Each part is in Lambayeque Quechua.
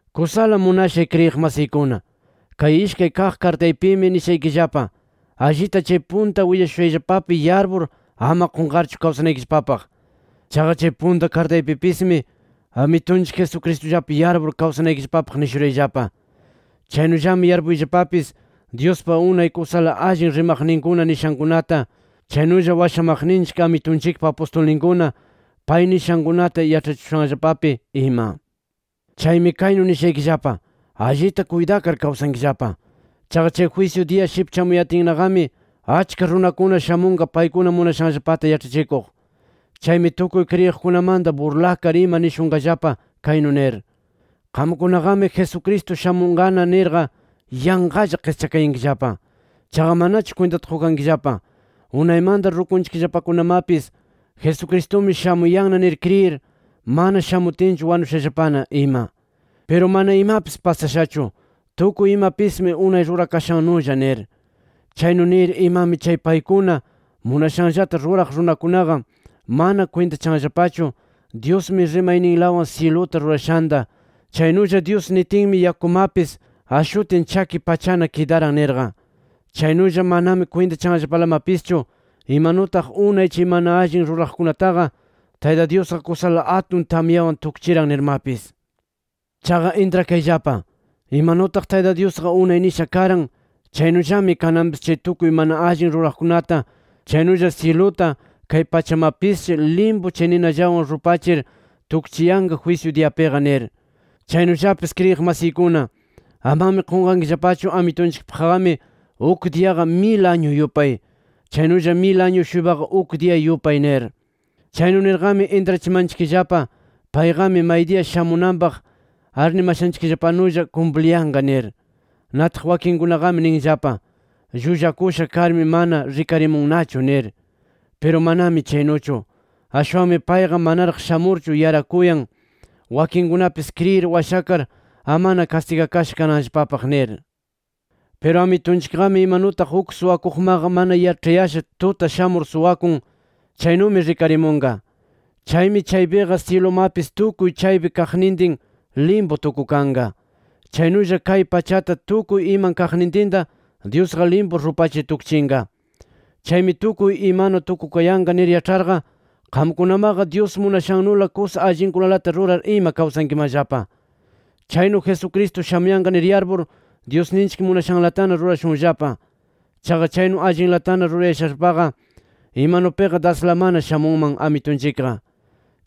Kusala munashay kriyiq masiykuna, kay ishkay kaq kartaypimi nishaykillapa, allita chay punta willashushayllapapi yarpur ama qunqarchu kawsanaykillapapaq. Chaqa chay punta kartaypipismi Amitunchik Jesucristullapi yarpur kawsanaykillapapaq nishurayllapa. Chaynullami yarpuyllapapis Dyuspa unay kusala allin rimaqninkuna nishankunata, chaynulla washamaqninchik Amitunchikpa apustulninkuna pay nishankunata, yaĉhachishushanllapapi ima. Chaymi kaynu nishaykillapa: Allita kuytakar kawsankillapa. Chaqa chay jwisyu diya shipchamuyatinnaqami, achka runakuna shamunqa paykuna munashanllapata yaĉhachikuq. Chaymi tukuy kriyiqkunamanta burlakar ima nishunqallapa kaynu nir: Qamkunaqami Jesucristo shamunqana nirqa yanqalla qischakayankillapa. Chaqa manachu kwintata qukankillapa: Unaymanta rukunchikllapakunamapis Jesucristumi shamuyanna nir kriyir, mana shamutinchu wanushallapana ima. Piru mana imapis pasashachu, tukuy imapismi unay rurakashannulla nir. Chaynu nir imami chay paykuna munashanllata ruraq runakunaqa, mana kwintachanllapachu Dyusmi rimayninlawan syiluta rurashanta, chaynulla Dyus nitinmi yakumapis ashutin chaki pachana kidaran nirqa. Chaynulla manami kwintachanllapalamapischu imanutaq unay chay mana allin ruraqkunataqa Tayta Dyusqa kusala atun tamyawan tukchiran nirmapis. Chaqa intrakayllapa: Imanutaq Tayta Dyusqa unay nisha karan, chaynullami kananpis chay tukuy mana allin ruraqkunata, chaynulla syiluta, kay pachamapisshi limpu chay ninallawan rupachir tukchiyanqa jwisyu diyapiqa nir. Chaynullapis kriyiq masiykuna, amami qunqankillapachu Amitunchikpaqqami uk diyaqa mil añu yupay, chaynulla mil añu-shuypaqa uk diya yupay nir. Chaynu nirqami intrachimanchikllapa payqami maydiya shamunanpaq arnimashanchikllapanulla kumpliyanqa nir. Nataq wakinkunaqami ninllapa: Llullakusha karmi mana rikarimunnachu nir. Piru manami chaynuchu. Ashwanmi payqa manaraq shamurchu yarakuyan, wakinkunapis kriyir washakar amana kastigakasha kananllapapaq nir. Piru Amitunchikqami, imanutaq uk suwakuqmaqa mana yaĉhayasha [tuta] shamur suwakun, chaynumi rikarimunqa. Chaymi chaypiqa syilumapis tukuy chaypi kaqnintin limpu tukukanqa. Chaynulla kay pachata tukuy iman kaqnintinta Dyusqa limpu rupachir tukchinqa. Chaymi tukuy imanu tukukayanqa nir yaĉharqa, qamkunamaqa Dyus munashannula kusa allinkunalata rurar ima kawsankimanllapa. Chaynu Jesucristo shamuyanqa nir yarpur Dyusninchik munashanlatana rurashunllapa. Chaqa chaynu allinlatana rurayashallapaqa imanupiqa daslamana shamunman Amitunchikqa.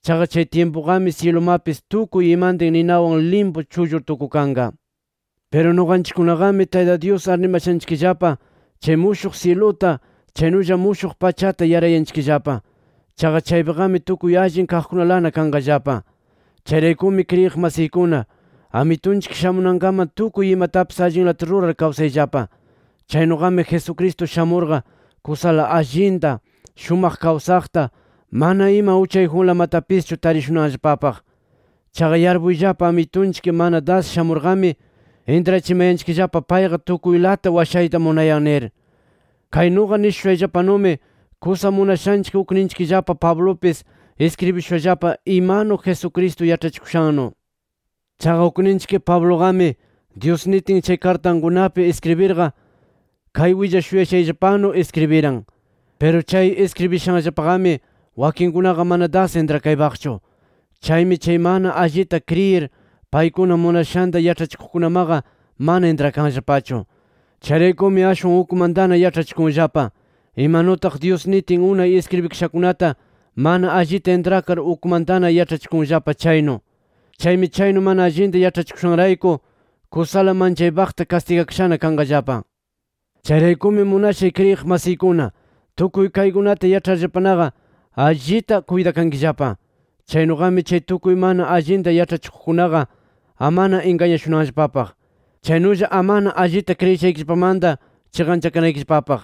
Chaqa chay tyimpuqami syilumapis tukuy imantin ninawan limpu chullur tukukanqa. Piru nuqanchikkunaqami Tayta Dyus arnimashanchikllapa chay mushuq syiluta, chaynulla mushuq pachata yarayanchikllapa. Chaqa chaypiqami tukuy allin kaqkunalana kanqallapa. Chayraykumi kriyiq masiykuna, Amitunchik shamunankaman tukuy imatapis allinlata rurar kawsayllapa. Chaynuqami Jesucristo shamurqa kusala allinta, shumaq kawsaqta, mana ima uchayjunlamatapischu tarishunanllapapaq. Chaqa yarpuyllapa, Amitunchik mana das shamurqami, intrachimayanchikllapa payqa tukuylata washayta munayan nir. Kay nuqa nishushayllapanumi kusa munashanchik ukninchikllapa Pablupis iskribishushallapa, imanu Jesucristo yaĉhachikushannu. Chaqa ukninchik Pabluqami Dyus nitin chay kartankunapi iskribirqa kay willashuyashayllapanu iskribiran. Piru chay iskribishanllapaqami wakinkunaqa mana das intrakaypaqchu. Chaymi chay mana allita kriyir paykuna munashanta yaĉhachikuqkunamaqa mana intrakanllapachu. Chayraykumi ashwan ukmantana yaĉhachikunllapa, imanutaq Dyus nitin unay iskribikashakunata mana allita intrakar ukmantana yaĉhachikunllapa chaynu. Chaymi chaynu mana allinta yaĉhachikushanrayku kusala manchaypaqta kastigakashana kanqallapa. Chayraykumi munashay kriyiq masiykuna, tukuy kaykunata yaĉharllapanaqa allita kuytakankillapa. Chaynuqami chay tukuy mana allinta yaĉhachikuqkunaqa amana ingañashunanllapapaq. Chaynulla amana allita kriyishaykillapamanta chiqanchakanaykillapapaq.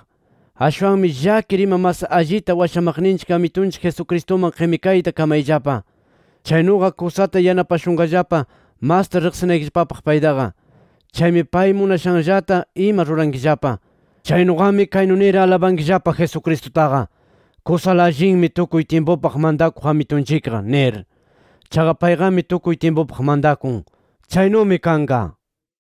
Ashwanmi llakir ima mas allita washamaqninchik Amitunchik Jesucristuman qimikayta kamayllapa. Chaynuqa kusata yanapashunqallapa masta riqsinaykillapapaq paytaqa. Chaymi pay munashanllata ima rurankillapa. Chaynuqami kaynu nir alabankillapa Jesucristutaqa: “Kusala allinmi tukuy tyimpupaq mantakuq Amitunchikqa” nir. Chaqa payqami tukuy tyimpupaq mantakun. Chaynumi kanqa.